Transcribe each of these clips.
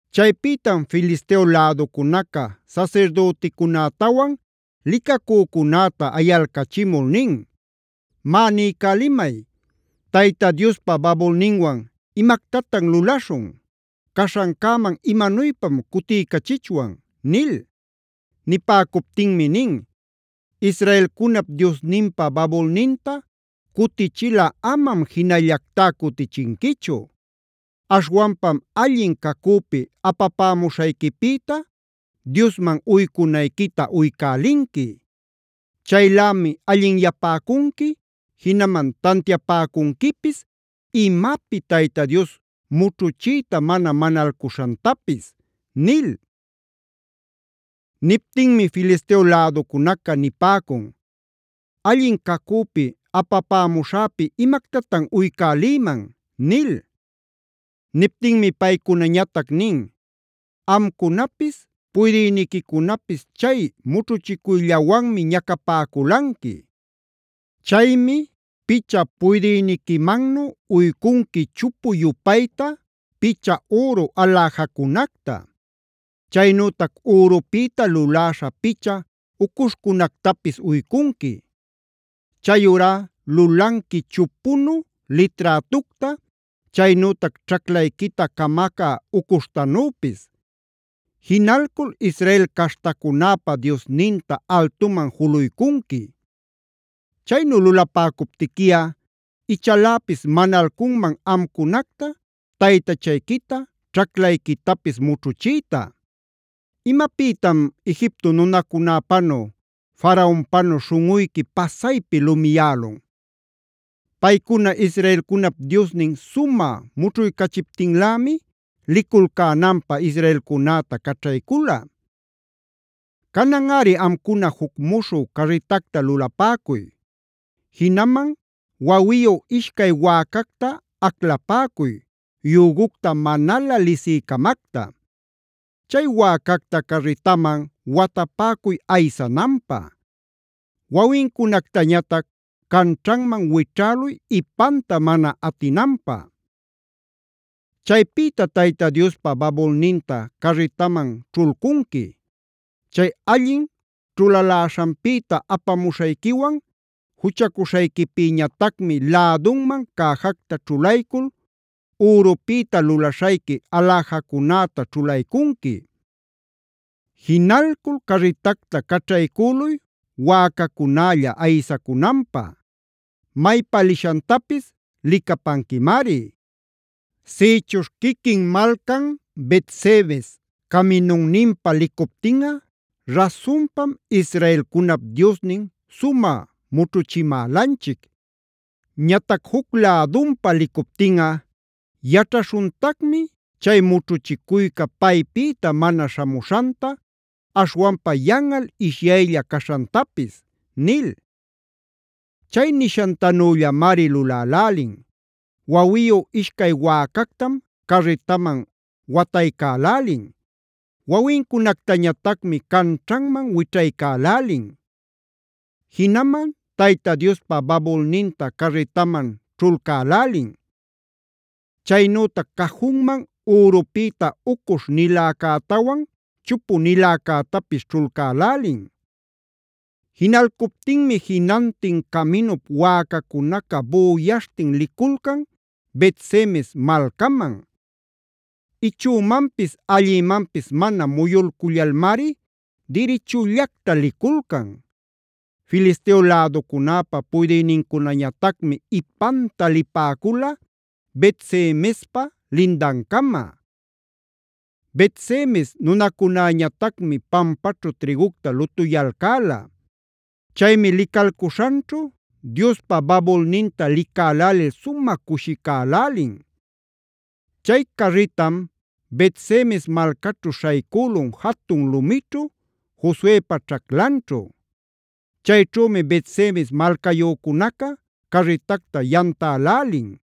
Chaypïtam Filisteo läducunaca sasirdüticunätawan licacücunäta ayalcachimul nin: “Má niycälimay, ¿Tayta Diospa babulninwan imactatan lulaśhun? ¿Caśhancäman imanuypam cutiycächichwan?” nil. Nipäcuptinmi nin: “Israelcunap Diosninpa babulninta cutichilꞌa amam jinallactá cutichinquichu. Aśhwanpam allin cacüpi apapämuśhayquipïta Diosman uycunayquita uycälinqui. Chaylämi allinyapäcunqui, jinaman tantiapäcunquipis imapi Tayta Dios mućhuchiyta mana manalcuśhantapis” nil. Niptinmi Filisteo läducunaca nipäcun: “¿Allin cacüpi apapämuśhäpi imactatan uycälïman?” nil. Niptinmi paycunañatac nin: “Amcunapis puydïniquicunapis chay mućhuchicuyllawanmi ñacapäculanqui. Chaymi picha puydïniquimannu uycunqui chupu-yupayta picha üru aläjacunacta. Chaynütac ürupïta luläśha picha ucuśhcunactapis uycunqui. Chayurá lulanqui chupunu liträtucta, chaynütac ćhaclayquita camacä ucuśhtanüpis. Jinalcul Israel caśhtacunäpa Diosninta altuman juluycunqui. Chaynu lulapäcuptiquiꞌa ichaläpis manalcunman amcunacta, taytachayquita, ćhaclayquitapis mućhuchiyta. ¿Imapïtam Egipto nunacunäpanu, Faraonpänu śhunꞌuyqui pasaypi lumiyälun? Paycuna israelcunap Diosnin sumä mućhuycächiptinlämi liculcänanpä israelcunäta caćhaycula. Cananꞌari amcuna juc muśhü carritacta lulapäcuy. Jinaman wawiyu ishcay wäcacta aclapäcuy, yügucta manalä lisï-camacta. Chay wäcacta carritaman watapäcuy aysananpä; wawincunactañatac canćhanman wićhäluy ipanta mana atinanpä. Chaypïta Tayta Diospa babulninta carritaman ćhulcunqui. Chay allin ćhulaläśhanpïta apamuśhayquiwan juchacuśhayquipïñatacmi lädunman cäjacta ćhulaycul ürupïta lulaśhayqui aläjacunäta ćhulaycunqui. Jinalcul carritacta caćhaycüluy wäcacunälla aysacunanpä. Maypa lishantapis licapanquimari. Sïchuśh quiquin malcan Bet-semes caminunninpa licuptinꞌa rasunpam israelcunap Diosnin sumä mućhuchimälanchic. Ñatac juc lädunpa licuptinꞌa yaćhaśhuntacmi chay mućhuchicuyca paypïta mana śhamuśhanta, aśhwanpa yanꞌal ishyaylla caśhantapis” nil. Chay nishantanüllamari lulälälin. Wawiyu ishcay wäcactam carritaman wataycälälin. Wawincunactañatacmi canćhanman wićhaycälälin. Jinaman Tayta Diospa babulninta carritaman ćhulcälälin. Chaynütac cajunman ürupïta ucuśh-niläcätawan chupu-niläcätapis ćhulcälälin. Jinalcuptinmi jinantin caminup wäcacunaca büyaśhtin liculcan Bet-semes malcaman. Ichümanpis allïmanpis mana muyulcullalmari dirichullacta liculcan. Filisteo läducunäpä puydïnincunañatacmi ipanta lipäcula Bet-semespa lindancama. Bet-semes nunacunäñatacmi pampaćhu trïgucta lutuyalcäla. Chaymi licalcuśhanćhu Diospa babulninta licalälil sumä cushicälälin. Chay carritam Bet-semes malcaćhu śhaycülun jatun lumićhu, Josuepa ćhaclanćhu. Chayćhümi Bet-semes malcayücunaca carritacta yamtälälin;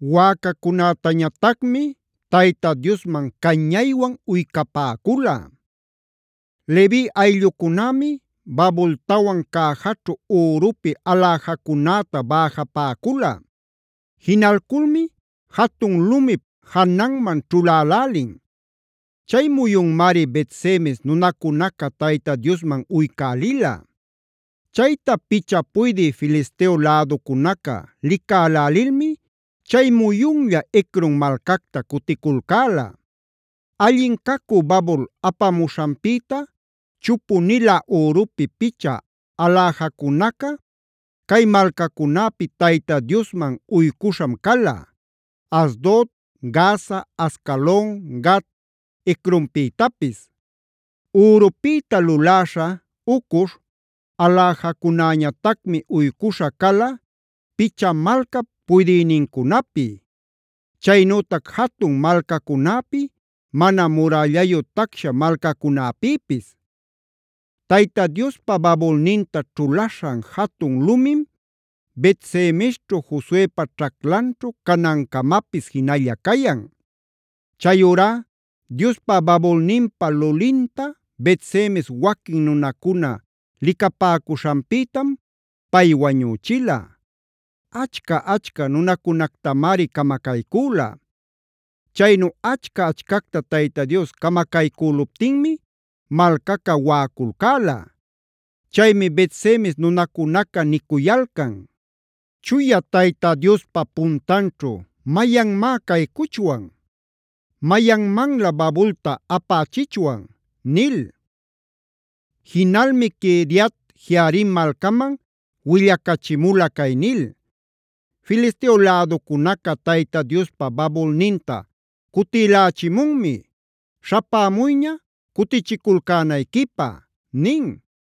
wäcacunätañatacmi Tayta Diosman cañaywan uycapäcula. Levi ayllucunämi babultawan cäjaćhu ürupi aläjacunäta bäjapäcula. Jinalculmi jatun lumip jananman ćhulälälin. Chay muyunmari Bet-semes nunacunaca Tayta Diosman uycälila. Chayta picha puydï Filisteo läducunaca licälälilmi chay muyunlla Ecron malcacta cuticulcäla. Allin cacü babul apamuśhanpïta chupu-nilä ürupi picha aläjacunaca cay malcacunäpi Tayta Diosman uycuśham cala: Asdod, Gaza, Ascalon, Gat, Ecronpïtapis. Ürupïta luläśha ucuśh aläjacunäñatacmi uycuśhä cala, picha malcap puydïnincunapi. Chaynütac jatun malcacunäpi, mana murällayu tacsha malcacunäpïpis. Tayta Diospa babulninta ćhulaśhan jatun lumim Bet-semesćhu Josuepa ćhaclanćhu canancamapis jinalla cayan. Chayurá Diospa babulninpa lulinta Bet-semes waquin nunacuna licapäcuśhanpïtam pay wañüchila. Achca-achcaa nunacunactamari camacaycüla. Chaynu achca-achcacta Tayta Dios camacaycüluptinmi malcaca waꞌaculcäla. Chaymi Bet-semes nunacunaca nicuyalcan: “¿Chuya Tayta Diospa puntanćhu mayanmá caycuchwan? ¿Mayanmanlä babulta apächichwan?” nil. Jinalmi Quiriat-jearim malcaman willacachimula cay nil: “Filisteo läducunaca Tayta Diospa babulninta cutïlächimunmi. Śhapämuyña cutichiculcänayquipä” nin.